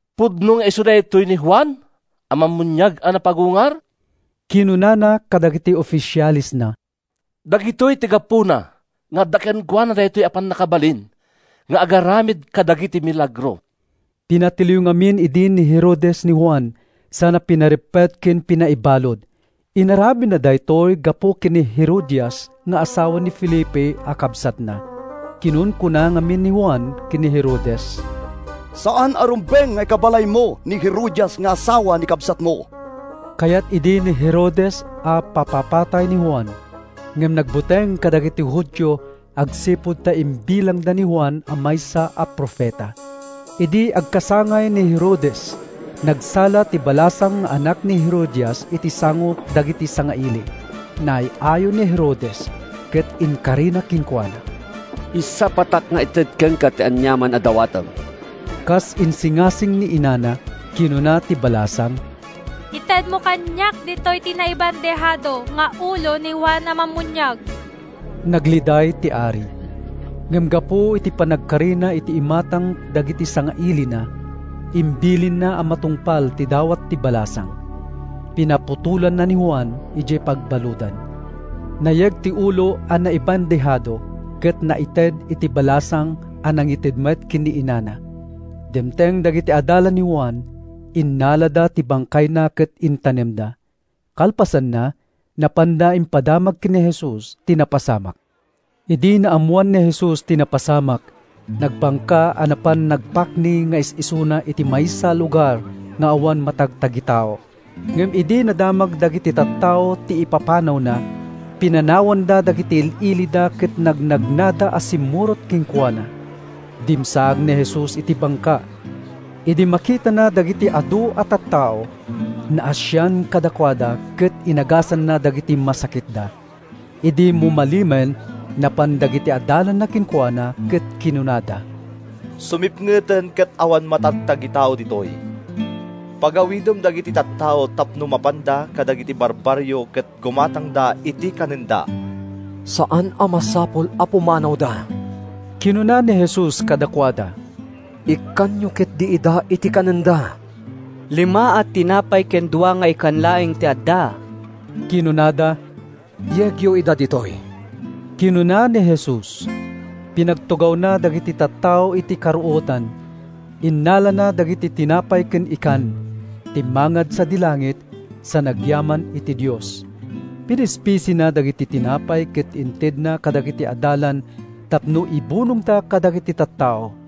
“Pudno nga isu daytoy ni Juan a Mammuniag a napagungar,” kinunana kadagiti ofisialesna. “Dagitoy ti gapuna nga adda kenkuana daytoy a pannakabalin nga agaramid kadagiti milagro.” Pinatiliw ngamin idi ni Herodes ni Juan sana pinareppet ken pinaibalud. Inaramidna daytoy gapu ken ni Herodias nga asawa ni Felipe a kabsatna. Kinunkuna ngamin ni Juan ken ni Herodes, “Saan a rumbeng nga ikabbalaymo ni Herodias nga asawa ni kabsatmo.” Kayat idi ni Herodes a papapatay ni Juan, ngem nagbuteng kadagiti Judio agsipud ta imbilangda ni Juan a maysa a profeta. Idi agkasangay ni Herodes, nagsala ti balasang nga anak ni Herodias iti sango dagiti sangaili. Naay-ayo ni Herodes ket inkarina kenkuana, “Isapatak nga ited kenka ti aniaman a dawatem.” Kas insingasing ni inana, kinuna ti balasang, “Itedmo kaniak ditoy ti naibandehado nga ulo ni Juan a Mammuniag.” Nagliday ti ari, ngem gapu iti panagkarina iti imatang dagiti sangailina, imbilinna a matungpal ti dawat ti balasang. Pinaputolanna ni Juan idiay pagbaludan. Nayeg ti ulo a naibandehado ket naited iti balasang a nangited met ken ni inana. Dimteng dagiti adalan ni Juan, innalada ti bangkayna ket intanemda. Kalpasanna, napanda impadamag ken ni Jesus ti napasamak. Idi naammoan ni Jesus ti napasamak, nagbangka a napan nagpakni nga is-isuna iti maysa a lugar nga awan matagtagitao. Ngem idi nadamag dagiti tattao ti ipapanawna, pinanawanda dagiti il-ilida ket nagnagnada a simmurot kenkuana. Dimsaag ni Jesus iti bangka. Idi makitana dagiti adu a tattao, naasian kadakuada ket inagasanna dagiti masakitda. Idi mumalemen, napan dagiti adalanna kenkuana ket kinunada, “Sumipngeten ket awan matagtagitao ditoy. Pagawidem dagiti tattao tapno mapanda kadagiti barbarrio ket gumatangda iti kanenda.” “Saan a masapul a pumanawda,” kinuna ni Jesus kadakuada. “Ikkanyo ketdi ida iti kanenda.” “Lima a tinapay ken dua nga ikan laeng ti adda,” kinunada. “Yegyo ida ditoy,” kinuna ni Jesus. Pinagtugawna dagiti tattao iti karuotan. Innalana dagiti tinapay ken ikan, timmangad sadi langit, sa nagyaman iti Dios. Pinispisina dagiti tinapay ket intedna kadagiti adalan tapno ibunongda kadagiti tattao.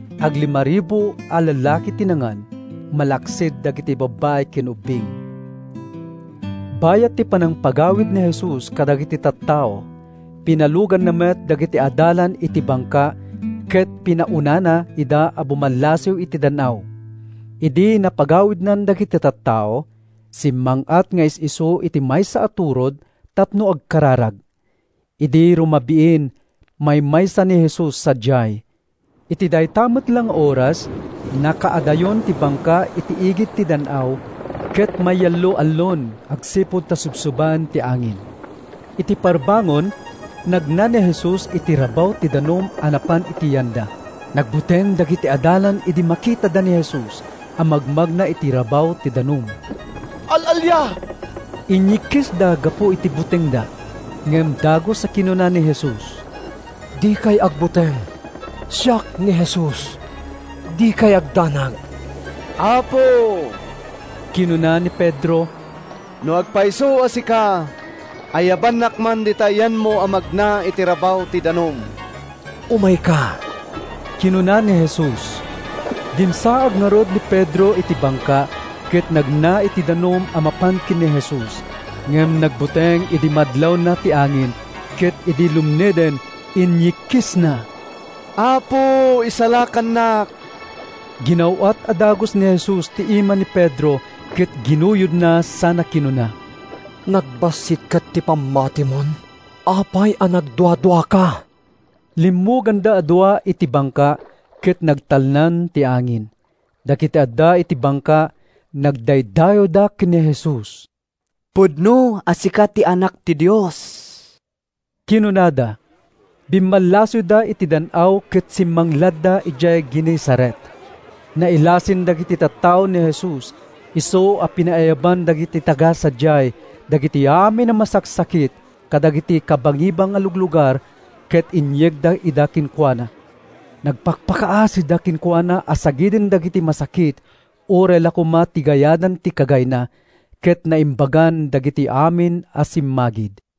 Aglimaribu a lallaki ti nangan, malaksid dagiti babbai ken ubbing. Bayat ti panangpagawid ni Jesus kadagiti tattao, pinaluganna met dagiti adalan iti bangka ket pinaunana ida a bumallasiw iti dan-aw. Idi napagawidnan dagiti tattao, simmang-at nga is-isu iti maysa a turod tapno agkararag. Idi rumabiin, maymaysa ni Jesus sadiay. Iti dayta met la nga oras, nakaadayon ti bangka iti igid ti dan-aw ket mayallo-allon agsipud ta subsubaen ti angin. Iti parbangon, nagna ni Jesus iti rabaw ti danum a napan iti yanda. Nagbuteng dagiti adalan idi makitada ni Jesus a magmagna iti rabaw ti danum. “Al-alia!” inyikkisda gapu iti butengda. Ngem dagus a kinuna ni Jesus, “Dikay agbuteng! Siak ni Jesus, dikay agdanag.” “Apo,” kinuna ni Pedro, “no agpayso a sika, ayabannak man dita yanmo a magna iti rabaw ti danum.” “Umayka,” kinuna ni Jesus. Dimsaag ngarud ni Pedro iti bangka ket nagna iti danum a mapan ken ni Jesus. Ngem nagbuteng idi madlawna ti angin, ket idi lumneden, inyikkisna, “Apo, isalakannak!” Ginaw-at a dagus ni Jesus ti ima ni Pedro ket ginuyodna sana kinuna, “Nagbassit ket ti pammatimon! Apay a nagduaduaka?” Limmuganda a dua iti bangka ket nagtalnan ti angin. Dagiti adda iti bangka nagdaydayawda ken ni Jesus. “Pudno a sika ti Anak ti Dios,” kinunada. Bimmallasiwda iti dan-aw ket simmangladda idiay Genesaret. Nailasin dagiti tattao ni Jesus, isu a pinaayaban dagiti taga-sadiay dagiti amin a masaksakit kadagiti kabangibang a luglugar ket inyegda ida kenkuana. Nagpakpakaasida kenkuana a sagiden dagiti masakit uray la koma ti gayadan ti kagayna, ket naimbagan dagiti amin a simmagid.